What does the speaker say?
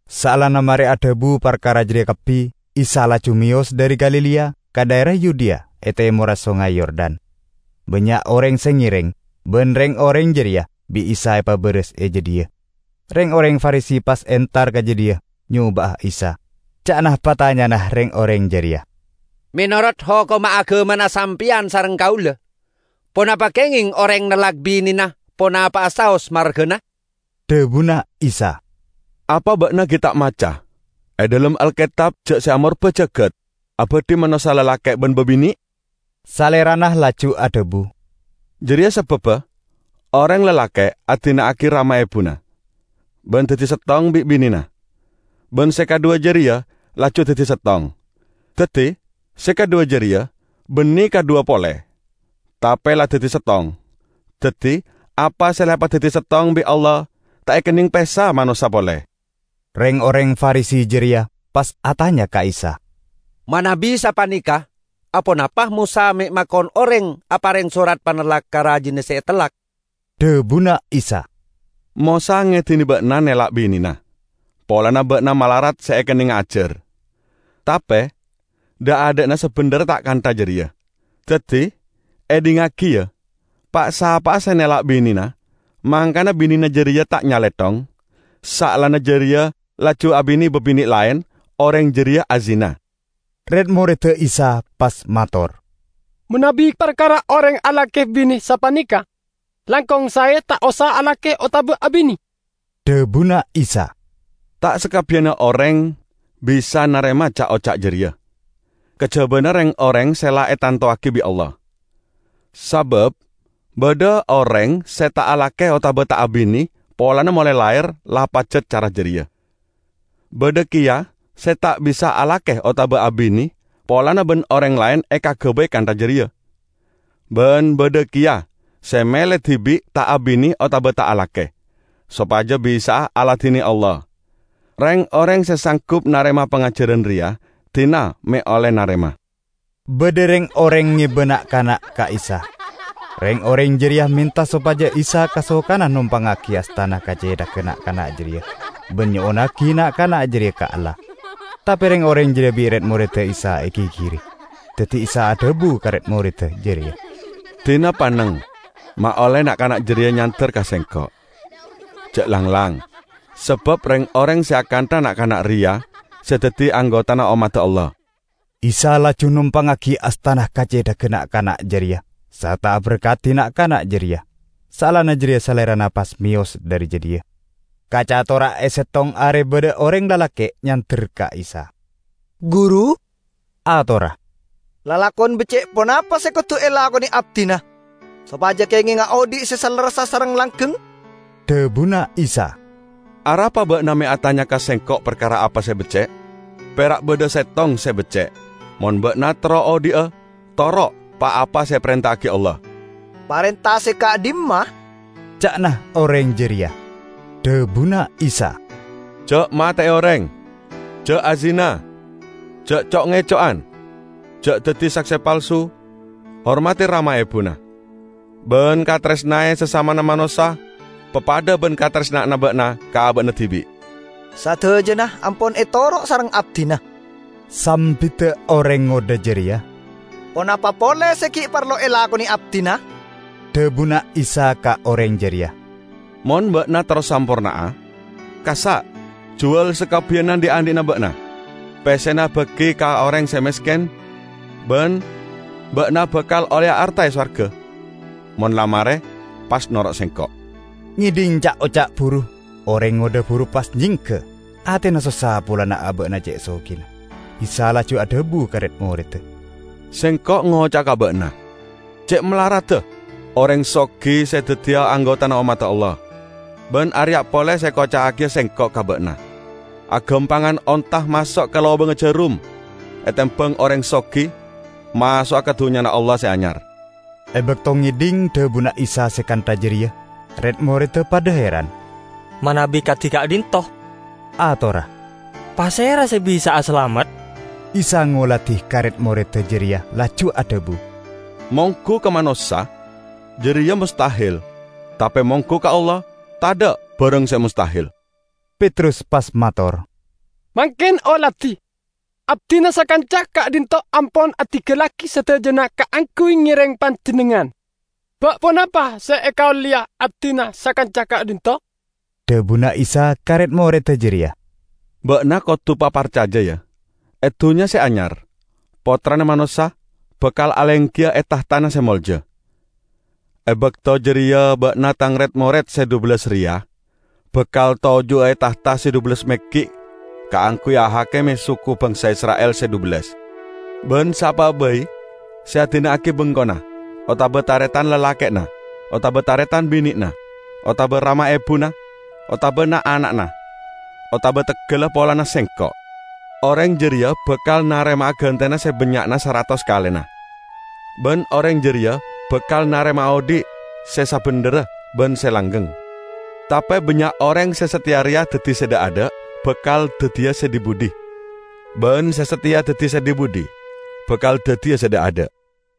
Saellana mare adhabu parkara jareya kabbi, Isa laju meyos dhari Galilea ka dhaera Yudea e temorra Songay Yordan. Bannya' oreng se ngereng, ban reng-oreng jareya bi' Isa epabaras e jadhiya. Reng-oreng Farisi pas entar ka jadhiya nyoba'a Isa. Ca'na patanyana reng-oreng jareya, "Menorot hokomma agamana sampeyan sareng kaula, ponapa kengeng oreng nellak binena ponapa'a saos margana?" Dhabuna Isa, "Apa ba'na gi' ta' maca e dhalem Alketab ja' Se Amorba Jagat abadhi manossa lalake' ban babine'? Salerana laju adhabu, 'Jareya sababba oreng lalake' adina'agi rama ebuna ban daddi settong bi' binena, ban se kadhuwa jareya laju daddi settong.' Daddi se kadhuwa jareya banne kadhuwa pole, tape la daddi settong. Daddi apa se la epadaddi settong bi' Allah ta' ekenneng pesa manossa pole." Reng-oreng Farisi jareya pas atanya ka Isa, "Manabi sapaneka aponapa Mosa me' makon oreng apareng sorat panellak ka rajina se etellak?" Dhabuna Isa, "Mosa ngedine ba'na nellak binena polana ba'na malarat se ekennenga ajar. Tape dha'-adha'na sabendherra ta' kantha jareya. Daddi, edhingngagi, ya: Pa'-sapa'a se nellak binena, mangkana binena jareya ta' nyalethong, saellana jareya laju abine babine' laen, oreng jareya azina." Red-moredda Isa pas mator, "Manabi parkara oreng alake bine sapaneka, langkong sae ta' osa alake otaba abine." Dhabuna Isa, "Ta' sakabbiyanna oreng bisa narema ca'-oca' jareya, kajabana reng-oreng se la etantowagi bi' Allah. Sabab badha oreng se ta' alake otaba ta' abine polana molae lahir la pajat cara jareya. Badha keya se ta' bisa alake otaba abine polana ban oreng laen ekagabay kantha jareya. Ban badha keya se mele dibi' ta' abine otaba ta' alake, sopaja bisa'a aladine Allah. Reng-oreng se sanggup narema pangajaran reya, dina me' olle narema." Badha reng-oreng ngeba na'-kana' ka Isa. Reng-oreng jareya menta sopaja Isa kasokana nompangngagi astana ka cethagga na'-kana' jareya ban nyo'onnagi na'-kana' jareya ka Allah. Tape reng-oreng jareya bi' red-moredda Isa egigiri. Daddi Isa adhabu ka red-moredda jareya, "Dina panneng ma' olle na'-kana' jareya nyander ka Sengko'! Ja' langlang, sabab reng-oreng se akantha na'-kana' reya se daddi anggotana ommadda Allah." Isa laju nompangngagi astana ka cethagga na'-kana' jareya sarta aberkadi na'-kana' jareya. Saellana jareya Salerana pas meyos dhari jadhiya. Kacatora e settong are badha oreng lalake' nyander ka Isa. "Guru," atorra, "lalakon becce' ponapa se kodu elakone abdina sopaja kengenga odhi' se salerressa sareng se langgeng?" Dhabuna Isa, "Arapa ba'na me' atanya ka Sengko' parkara apa se becce'? Pera' badha Settong se becce'. Mon ba'na terro odhi'a, toro' pa-apa se eparenta'agi Allah." "Parenta se ka'dhimma?" ca'na oreng jareya. Dhabuna Isa, "Ja' mate'e oreng, ja' azina, ja' co'-ngeco'on, ja' daddi sakse palsu, hormadi rama ebuna; ban kataresnae sasamana manossa papadha ban kataresna'anna ba'na ka aba'na dibi'." "Sadajana ampon etoro' sareng abdina," sambidda oreng ngodha jareya. "Ponapa pole se gi' parlo elakone abdina?" Dhabuna Isa ka oreng jareya, "Mon ba'na terro samporna'a, kassa' juwal sakabbiyanna dhi'-andhi'na ba'na. Pessena bagi ka oreng se mesken, ban ba'na bakal olleya arta e sowarga. Mon la mare, pas noro' Sengko'!" Ngedhing ca'-oca' buru, oreng ngodha buru pas nyengga; atena sossa polana aba'na ce' sogina. Isa laju adhabu ka red-moredda, "Sengko' ngoca'a ka ba'na, ce' malaradda oreng sogi se daddiya anggotana ommadda Allah. Ban areya' pole se ekoca'agiya Sengko' ka ba'na: agampangan onta maso' ka lobangnga jarum etembang oreng sogi maso'a ka Dunnyana Allah Se Anyar." E bakto ngedhing dhabuna Isa se kantha jareya, red-moredda padha heran. "Manabi kadi ka'dhinto'," atorra, "pasera se bisa'a salamet?" Isa ngoladi ka red-moredda jareya laju adhabu, "Monggu ka manossa, jareya mostahel! Tape monggu ka Allah, tadha' barang se mostahel." Petrus pas mator, "Mangken oladi, abdina sakanca ka'dhinto' ampon adinggallagi sadajana kaangguy ngereng Panjennengngan. Ba' ponapa se ekaolleya abdina sakanca ka'dhinto'?" Dhabuna Isa ka red-moredda jareya, "Ba'na kodu paparcaja, ya. E Dunnya Se Anyar, Pottrana Manossa bakal alenggiya e tahtana se molja. E bakto jareya ba'na Tang red-mored se dhubellas reya, bakal toju'a e tahta se dhubellas meggi' kaangguy ahakime suku bangsa Isra'il se dhubellas! Ban sapa'a bai se adina'agi bengkona, otaba taretan lalake'na otaba taretan bine'na, otaba rama ebuna, otaba na'-ana'na, otaba teggalla polana Sengko', oreng jareya bakal narema'a gantena se bannya'na saratos kalena. Ban oreng jareya bakal narema'a odhi' se sabendherra ban se langgeng. Tape bannya' oreng se sateya reya daddi se dha'-adha' bakal daddiya se dhi-budhi ban se sateya daddi se dhi-budhi bakal daddiya se dha'-adha'."